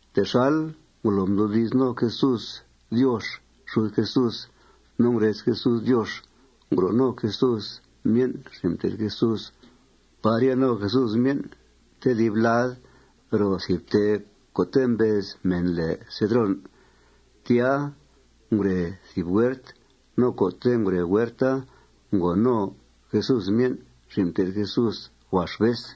Texal ngolo mdoodi's no Jesús Diox xud Jesús no ngurez Jesús Diox, ngro' no Jesús myen' xin' mté'th Jesús par ya no Jesús myen' tedib lad ro thìb ftee co' mbez mèn lèe Cedrón. Tya ngure thìb huert. No co'te' ngure huerta ngòo no Jesús myen' xin' mté'th Jesús huax vez.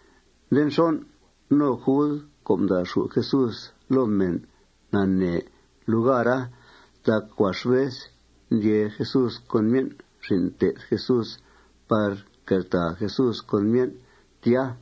Nde nxon', no Jud co' mda'xù' Jesús loo mèn nanee lugara. Tac huax vez ndyee Jesús con myen' xin' mté'th Jesús par nqueltàa Jesús con myen' tya.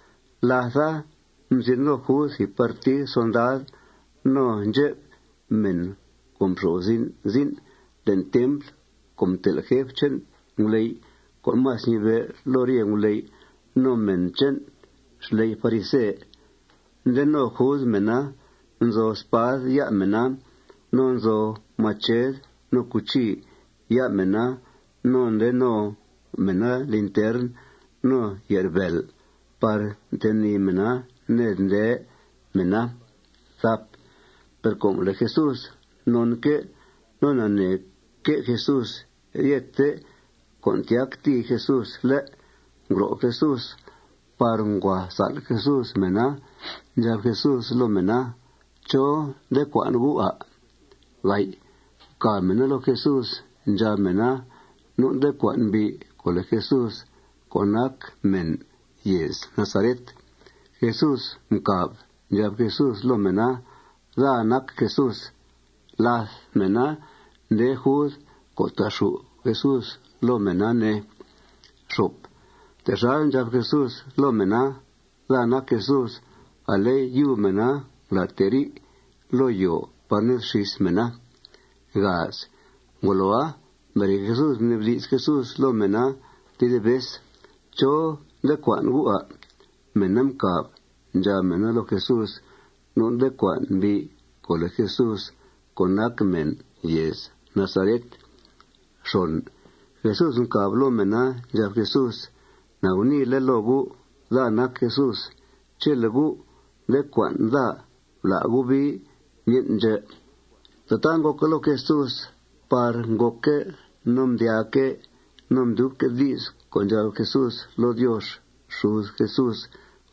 Látha, mzin no Jud thìb partid solndad, no ndxep mèn co' nxo'f zin' zin' le'n templ co' mtel' jef che'n nguley' co' más ñibe' loo rye nguley', no mèn che'n xley' farise. Nde no Jud mèna. Nzo spad ya' mèna no nzo mached no cuchi ya' mèna. No nde no mèna lintern no ye'rbèel par mtenìi mèna ned nde mèna. Per com le' Jesús nonque' no naneeque' Jesús ryethe con' tyactìi Jesús, ¿lé'?, ngro' Jesús par ngua sál' Jesús mèna. Ndxab Jesús loo mèna: ―¿Chó nde cua'n gu', à'? Mcàb mèna loo Jesús. Ndxab mèna: ―Nu' nde cua'n mbi' co' lèe Jesús co' nac mèn yèez Nazaret. Jesús mcàb. Ndxab Jesús loo mèna: ―Daa nac Jesús. Làth mèna nde Jud co' ta'xù' Jesús loo mèna, ne. Texal ndxab Jesús loo mèna: ―Daa nac Jesús, ale yub mèna ngulàateri' loo yòo par ned xís mèna. Ngoloa, mbere Jesús, mnibdi's Jesús loo mèna tedib vez: ―¿Chó nde cua'n gu', à'? Mèna mcàb. Ndxab mèna loo Jesús: ―Nu' nde cua'n mbi' co' lèe Jesús co' nac mèn yèez Nazaret. Jesús mcàb loo mèna. Ndxab Jesús: ―Na guniile' loo gu'. Daa nac Jesús. Chele' gu' nde cua'n daa, bla' gu' bii myen' ndxè'. Tataa ngòca loo Jesús par ngòcque' no mdyaaque' no mdyubque' di's co' ndxab Jesús loo Diox xud Jesús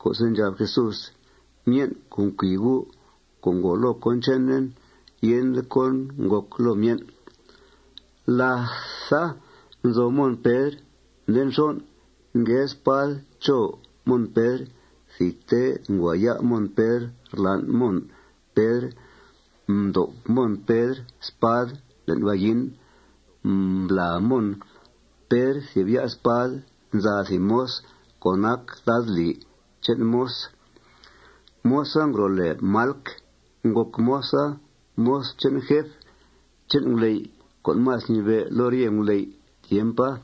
co'se' ndxab Jesús: ―Myen' co' mcui U', co' ngòo loo cón chenen, yende cón ngòc loo myen'. Látha nzo Mon Pedr. Nde nxon', ngue spad cho Mon Pedr. Thidte ngua ya' Mon Pedr rlan' Mon Pedr. Mdob Mon Pedr spad le'n vayin. Mblàa Mon thìb ya' spad nza thìb moz co' nac ladlì che'n moz. Moza ngro' lèe Malc. Ngòc moza moz che'n jef che'n nguley' co' más mnibe' loo rye nguley' tiempa.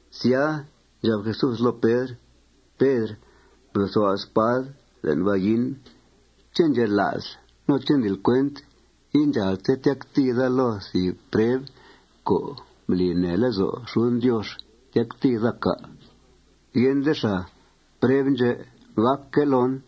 Sya, ndxab Jesús loo Pedr: ―Pedr, blosua' spad le'n vayin. ¿Ché' ndxela'sl no ndlil cuent indxàalte tyactìi daa loo thìb preb co' mbli nee lezo' xuden Diox tyactìi daa, cà'? Yende xàa. Preb ndxè' gàcque' loon.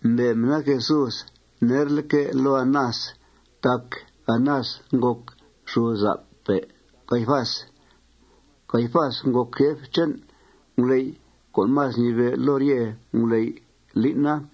Mbe' mèna Jesús nerleque' loo Anás tac Anás ngòc xudzap Caifás. Caifasa ngòc jef che'n nguley' co' más mnibe' loo rye nguley' lín'a.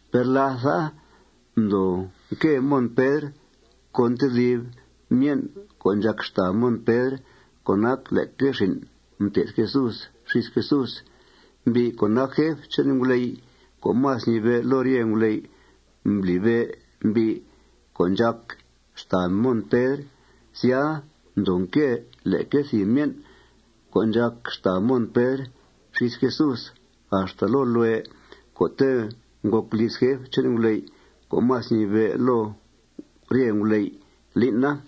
Per látha, mdoo nque Mon Pedr con tedib myen' co' ndxàc xtàa Mon Pedr co' nac leque xin' mté'th Jesús xís Jesús. Mbi' co' nac jef che'n nguley' co' más ñibe' loo rye nguley' mblibe' mbi' co' ndxàc xtàa Mon Pedr. Sya, mdoo nque leque thìb myen' co' ndxàc xtàa Mon Pedr xís Jesús axta loo lue' co'te' ngòc liz jef che'n nguley' co' más mnibe' loo rye nguley' lín'a.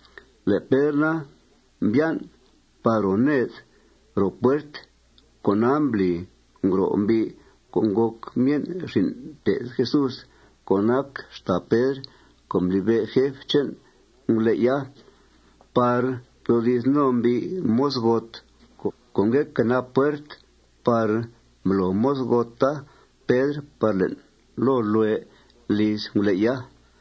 Le' Pedr na, mbyan' par ro ned ro puert. Cona mbli ngro' mbi' co' ngòc myen' xin' mté'th Jesús co' nac xtàa Pedr co' mblibe' jef che'n nguley'a par mdoodi's no mbi' mozgot co' ngue quenap puert par mblo mozgota Pedr par le'n loo lue' liz nguley'a.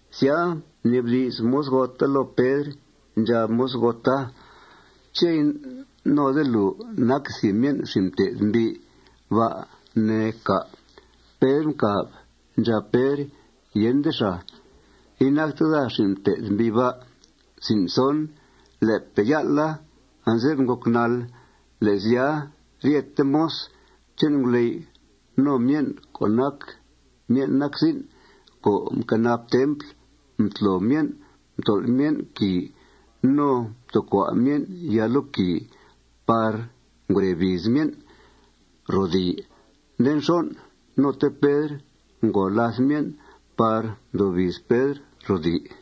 Sya, mnibdi's mozgota loo Pedr. Ndxab mozgota: ―¿Ché' inode lùu nac thìb myen' xin' mté'th mbi' ba', ne, cà'? Pedr mcàb. Ndxab Pedr: ―Yende xàa. Inacte daa xin' mté'th mbi' ba'. Le'pe' yál'a anze'f ngòc nàl. Le' sya, ryete moz che'n nguley' no myen' co' nac myen' nac zin' co' nquenap templ, mtlo myen', mtol' myen' quìi. No mtoocua' myen' yaa loo quìi par ngure biiz myen' ro rdii. Nde nxon', note Pedr ngo làth myen' par mdoo biiz Pedr ro dii.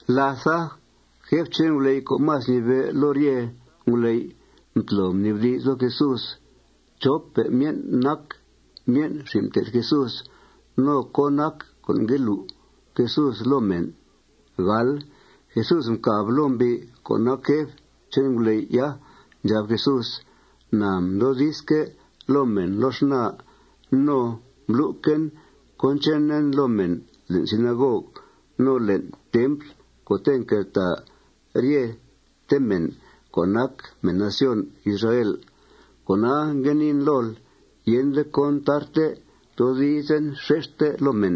Látha, jef che'n nguley' co' más ñibe' loo rye nguley' mtlo mnibdi's loo Jesús chópe' myen' nac myen' xin' mté'th Jesús no cón nac co' ngue lu' Jesús loo mèn. Jesús mcàb loo mbi' co' nac jef che'n nguley'a. Ndxab Jesús: ―Na mdoodizque' loo mèn loo xnaa. No mblu'quen cón chenen loo mèn le'n sinagog no le'n templ co'te' nqueltàa ryete mèn co' nac mèn nación Israel. Cona, ngue niin lool: Yende cón tarte toodizen xexte loo mèn.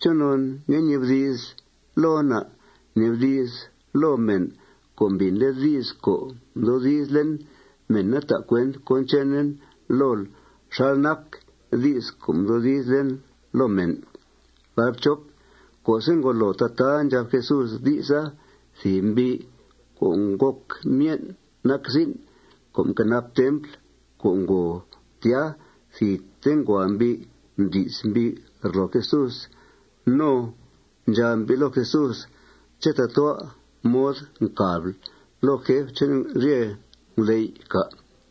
¿Chonon ngue ñibdi'sl loon, à'? Bnibdi's loo mèn co' mbìnle' di's co' mdoodizlen. Mèna ta' cuent cón chenen lool xal nac di's co' mdoodizlen loo mèn. Co'se' ngolo tataa ndxab Jesús di'sa, thìb mbi' co' ngòc myen' nac zin' co' nquenap templ co' ngo tya, thidte ngua mbi' mdi's mbi' rloo Jesús. No ndxab mbi' loo Jesús: ―¿Ché' tatua' mod ncàbl loo jefpe' che'n rye nguley', cà'?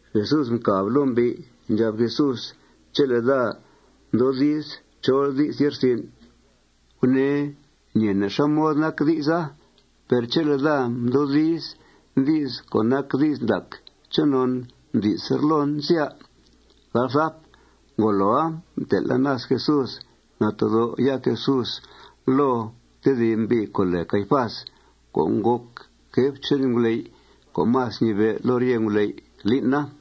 Jesús mcàb loo mbi'. Ndxab Jesús: ―Chele' daa mdoodiz chol di's ye'rsin', gunee ñeene' xá mod nac di'sa. Per chele' daa mdoodiz di's co' nac di's ndac, ¿chonon mdi'sl rloon, sya? Ngoloa, mtel' Anás Jesús natedó' ya' Jesús loo tedib mbi' co' lèe Caifás co' ngòc jef che'n nguley' co' más ñibe' loo rye nguley' lín'a.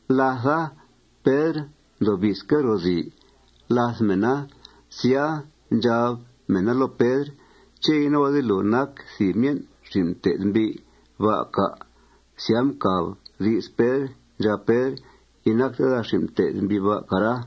Látha, Pedr ndoo biizque' ro rdii làth mèna. Sya, ndxab mèna loo Pedr: ―¿Ché' inode lùu nac thìb myen' xin' mté'th mbi' ba', cà'? Sya, mcà di's Pedr. Ndxab Pedr: ―Inacte daa xin' mté'th mbi' ba', cara.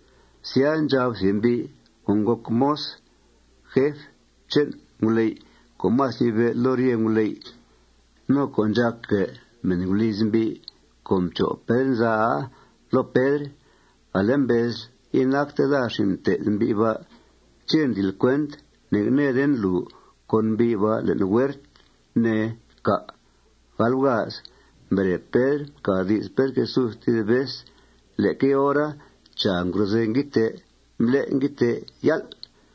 Sya, ndxab thìb mbi' co' ngòc moz jef che'n nguley' co' más ñibe' loo rye nguley' no co' ndxàcguè' mèn guliz mbi' co' mcho' Pedr nzaa loo Pedr: ―Ale mbezl: Inacte daa xin' mté'th mbi' ba'. ¿Ché' ndlil cuent ne'ngnèeden lùu con mbi' ba' le'n huert, ne, cà'? Mbere Pedr, mcà di's Pedr Jesús tedib vez. Leque hora, chàa, ngrozèe nguiidtee. Mblé' nguiidtee yál'.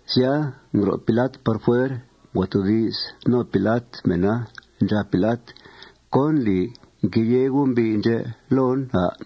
Sya, ngro' Pilat par fuer. Ngua toodi's no Pilat mèna. Ndxab Pilat: ―¿Cón ndli nqueyèe gu' mbi' ndxè' loon, à'?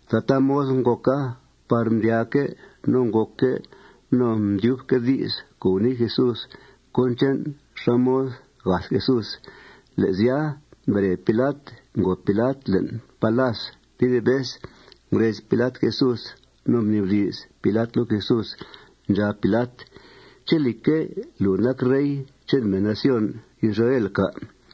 Tataa mod ngòca par mdyaaque' no ngòcque' no mdyubque' di's co' gunii Jesús cón che'n xá mod gath Jesús. Le' sya, mbere Pilat, ngòo Pilat le'n palas tedib vez. Ngurez Pilat Jesús. No mnibdi's Pilat loo Jesús. Ndxab Pilat: ―¿Ché', lìcque', lùu nac rey che'n mèn nación Israel, cà'?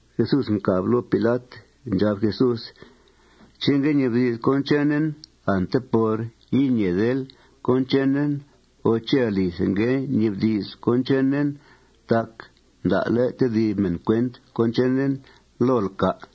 Jesús mcàb loo Pilat. Ndxab Jesús: ―¿Ché' ngue ñibdi'sl cón chenen ante por iñeedel cón chenen o ché' alithe ngue ñibdi'sl cón chenen tac mda'le' tedib mèn cuent cón chenen lool, cà'?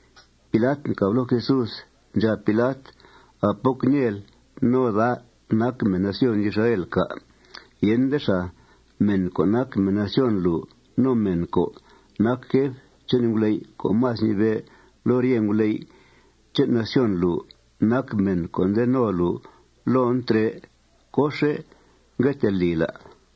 Pilat mcàb loo Jesús. Ndxab Pilat: ―¿A poc ñeel no daa nac mèn nación Israel, cà'? Yende xàa. Mèn co' nac mèn nación lùu no mèn co' nac jef che'n nguley' co' más ñibe' loo rye nguley' che'n nación lùu nac mèn co' nde no lùu loon trè'. ¿Cóxe' ngue tee lil, à'?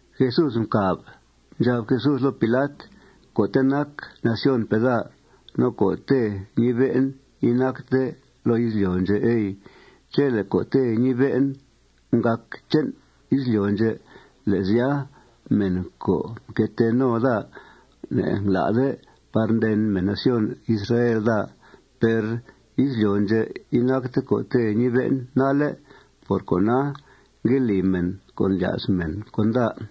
Jesús mcàb. Ndxab Jesús loo Pilat: ―Co'te' nac nacionpe' daa no co'te' ñibe'en inacte loo izlyo' ndxè', ey. Chele' co'te' ñibe'en ngàc che'n izlyo' ndxè', le' sya, mèn co' mque tee no daa ne'ngla'de par nden mèn nación Israel daa. Per izlyo' ndxè' inacte co'te' ñibe'en nalle'. Por cona, ngue li mèn con' ndlya's mèn con daa.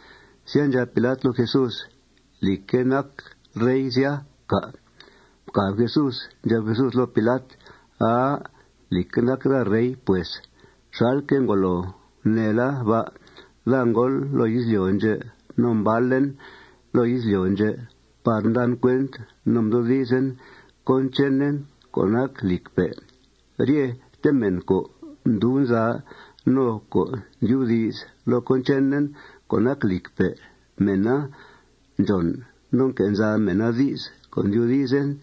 Sya, ndxab Pilat loo Jesús: ―¿Lìcque' nacl rey, sya, cà'? Mcàb Jesús. Ndxab Jesús loo Pilat: ―Aa. Lìcque' nac daa rey, pues, xalque' ngolo guneela ba'. Daa ngóol loo izlyo' ndxè' no mbalen loo izlyo' ndxè' par mdan cuent no mdoodizen cón chenen co' nac lìcpe'. Ryete mèn co' ndub nza no co' ndyubdi's loo cón chenen co' nac lìcpe', mèna ndxòn no nque' nza mèna di's co' ndyoodizen.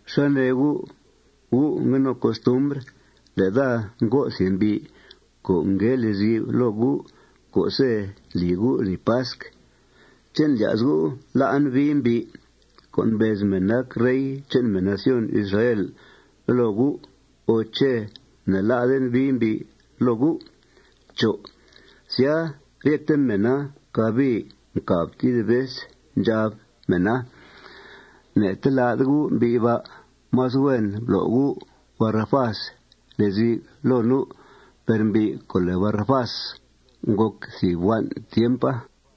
¿Xá nee gu'? Gu' ngue no costumbr le' daa ngo' thìb mbi' co' ngue lezi'f loo gu' co'se' ndli gu' lni pasc. ¿Ché' ndlya's gu' la'en bii mbi' co' mbez men nac rey che'n mèn nación Israel loo gu' o ché' ne'la'den bii mbi' loo gu'? Sya, ryete mèna cabii mcàb tedib vez. Ndxab mèna: ―Ne'telá'de U' mbi' ba'. Más huen blo' U' Barabás lezi'f loo nu'. Per mbi' co' lèe Barabás ngòc thìb huan' tiempa.